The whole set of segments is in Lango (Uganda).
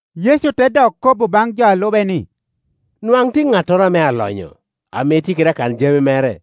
Yecu te dok kobo baŋ jo a lube ni, “Nwaŋ tye ŋattoro ame alonyo, ame tye kede akan-jami mere.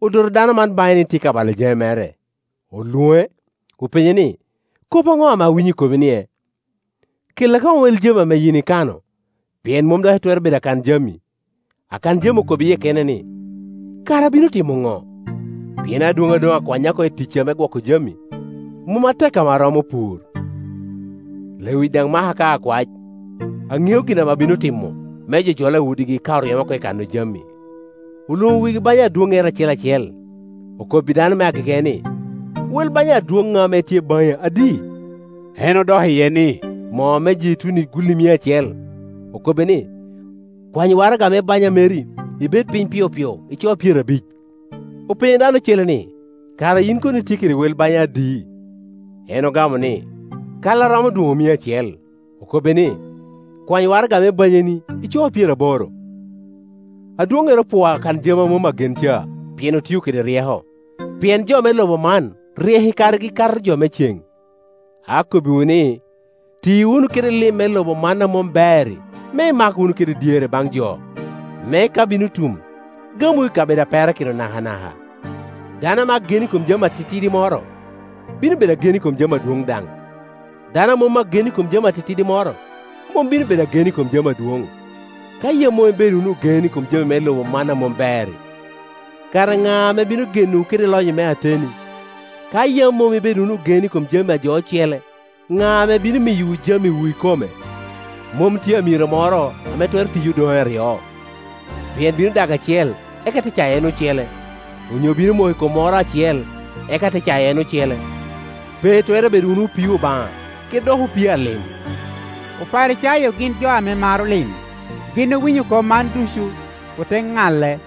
Odoto dano man baŋe ni tye ka balo jami mere. Olwoŋe, openye ni, ‘Kop aŋo ame awinyo i komi-nie? Kella koŋ wel jami ame yin ikano, pien mom dok itwero bedo akan-jami.’ Akan-jami okobo i yie kene ni, ‘Kara abino timo ŋo? Pien adwoŋŋa doŋ akwanya oko i ticca me gwoko jami. Mom atek ame aromo pur, lewic daŋ maka ka akwac. Aŋeo gin ame abino timo, me jo jola i udigi ka oryema oko i kano jami.’ Olwoŋo wegi banya adwoŋŋere acel acel, okobbi dano me agege ni, ‘Wel banya adwoŋŋa ame tye baŋi adi?’ En odok iye ni, ‘Moo me jeituni gulli mia acel.’ Okobbe ni, ‘Kwany waraga me banya meri, ibed piny piopio, ico pyerabic.’ Openyo dano ocele ni, ‘Kara yin kono itye kede wel banya adi?’ En ogamo ni, ‘Kal a romo dwoŋ mia acel.’ Okobbe ni, ‘Kwany waraga me banyani, ico pyeraboro.’ Adwoŋŋere opwoo akanjami a mom agen ca, pien otio kede ryeko; pien jo me lobo man ryek i karegi, kato jo me cen. Akobbiwu ni, ti wunu kede lim me lobo man a mom ber-ri me imak wunu kede dyere baŋ jo, me ka bino tum, gamwu i kabedo a perakino nakanaka. “Dano ame agen i kom jami atitidi moro, bino bedo agen i kom jami adwoŋ daŋ; dano a mom agen i kom jami atitidi moro, mom bino bedo agen i kom jami adwoŋ. Ka yam mom ibedo wunu ogen i kom lim me lobo man a mom ber-ri, kara ŋa ame bino genowu kede lonyo me ateni? Ka yam mom ibedo wunu ogen i kom jami a jo ocele, ŋa ame bino miyowu jamiwu ikome? Mom tye amiro moro ame twero tiyi odoŋe aryo; pien bino dago acel, eka te cayo en ocele; onyo bino moko i kom moko acel, eka te cayo en ocele. Pe itwero bedo wunu opii Obaŋa kede dok opii a lim.” Oparicayo gin jo ame maro lim; gin owinyo kop man ducu, ote ŋale.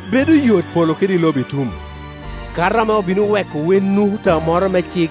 Bedo yot polo kede lobo itum, kato ame obino weko wen nukuta moro me cik.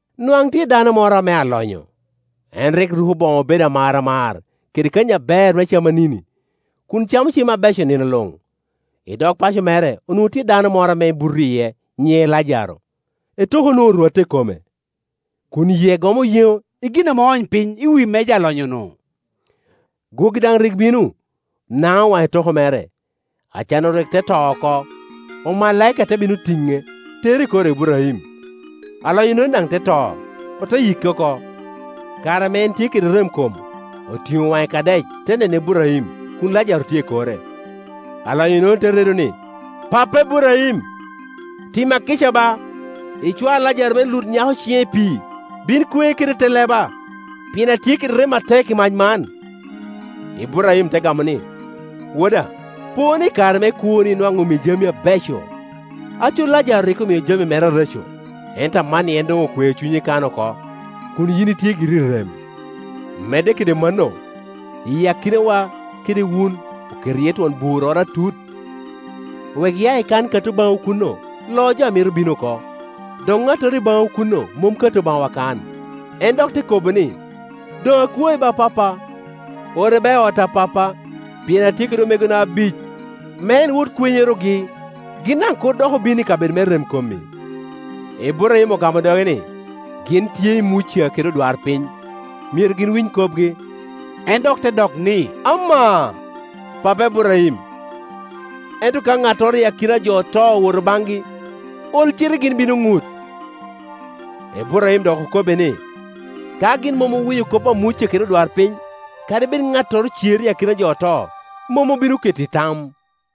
“Nwaŋ tye dano moro ame alonyo; en rik ruko boŋo obedo amaramar, kede kanyi aber me camanini, kun camo cem abeco nino luŋ. I dog paco mere onwoŋo tye dano moro ame buto iye nyiŋe Lajaro. Etoko onwoŋo orwatte i kome, kun yie gomo yeŋo i gin ame oony piny i wi meja alonyonu; gwogi daŋ rik bino, naŋo waŋ etoko mere. Acan-nu rik te to oko, omalaika te bino tiŋe, tere i kor Iburaim. Alonyo-nono daŋ te to, ote yike oko. Kare ame en tye kede remkom, otiŋo waŋe i Kadec te neno Iburaim kun Lajaro tye i kore. Alonyo-nono te redo ni, ‘Pappa, Iburaim, tima kica ba, icwaya Lajaro me lut nyako ciŋe i pii, bin kwe kede te leba, pien atye kede rem atek i mac man,’ Iburaim te gamo ni, ‘Woda, po ni, i kare me kwoni nwaŋ omii jamini abeco, aco Lajaro rik omio jami mere areco. Ento amanni en doŋ okweo cunye kan oko, kun yin itye giri i rem. Medde kede mano, iyi akinawa kede wun oketo iye twon burroro atut, wek ya i kan kato baŋwu kuno loo jo a mito bino oko, dok ŋattoro i baŋwu kuno mom kato baŋwa kan.’ En dok te kobo ni, ‘ooŋ akwai ba, Pappa, ore ba i ot a pappa, pien atye kede omegona abic, me en wot kwenyorogi, gin daŋ kur dok obin i kabedo me remkom-mi.’ Iburaim ogamo doge ni, ‘Gin tye i Muca kede odwarpiny; myero gin winy kopgi.’ En dok te dok ni, ‘Amaa, Pappa, Iburaim, ento ka ŋattoro i akina a jo oto owoto baŋgi, ol cite gin bino ŋut.’ Iburaim dok okobbe ni, ‘Ka gin mom owinyo kop a Muca kede odwarpiny, kadi bed ŋattoro cer i akina jo oto, mom obino keto i tam.’”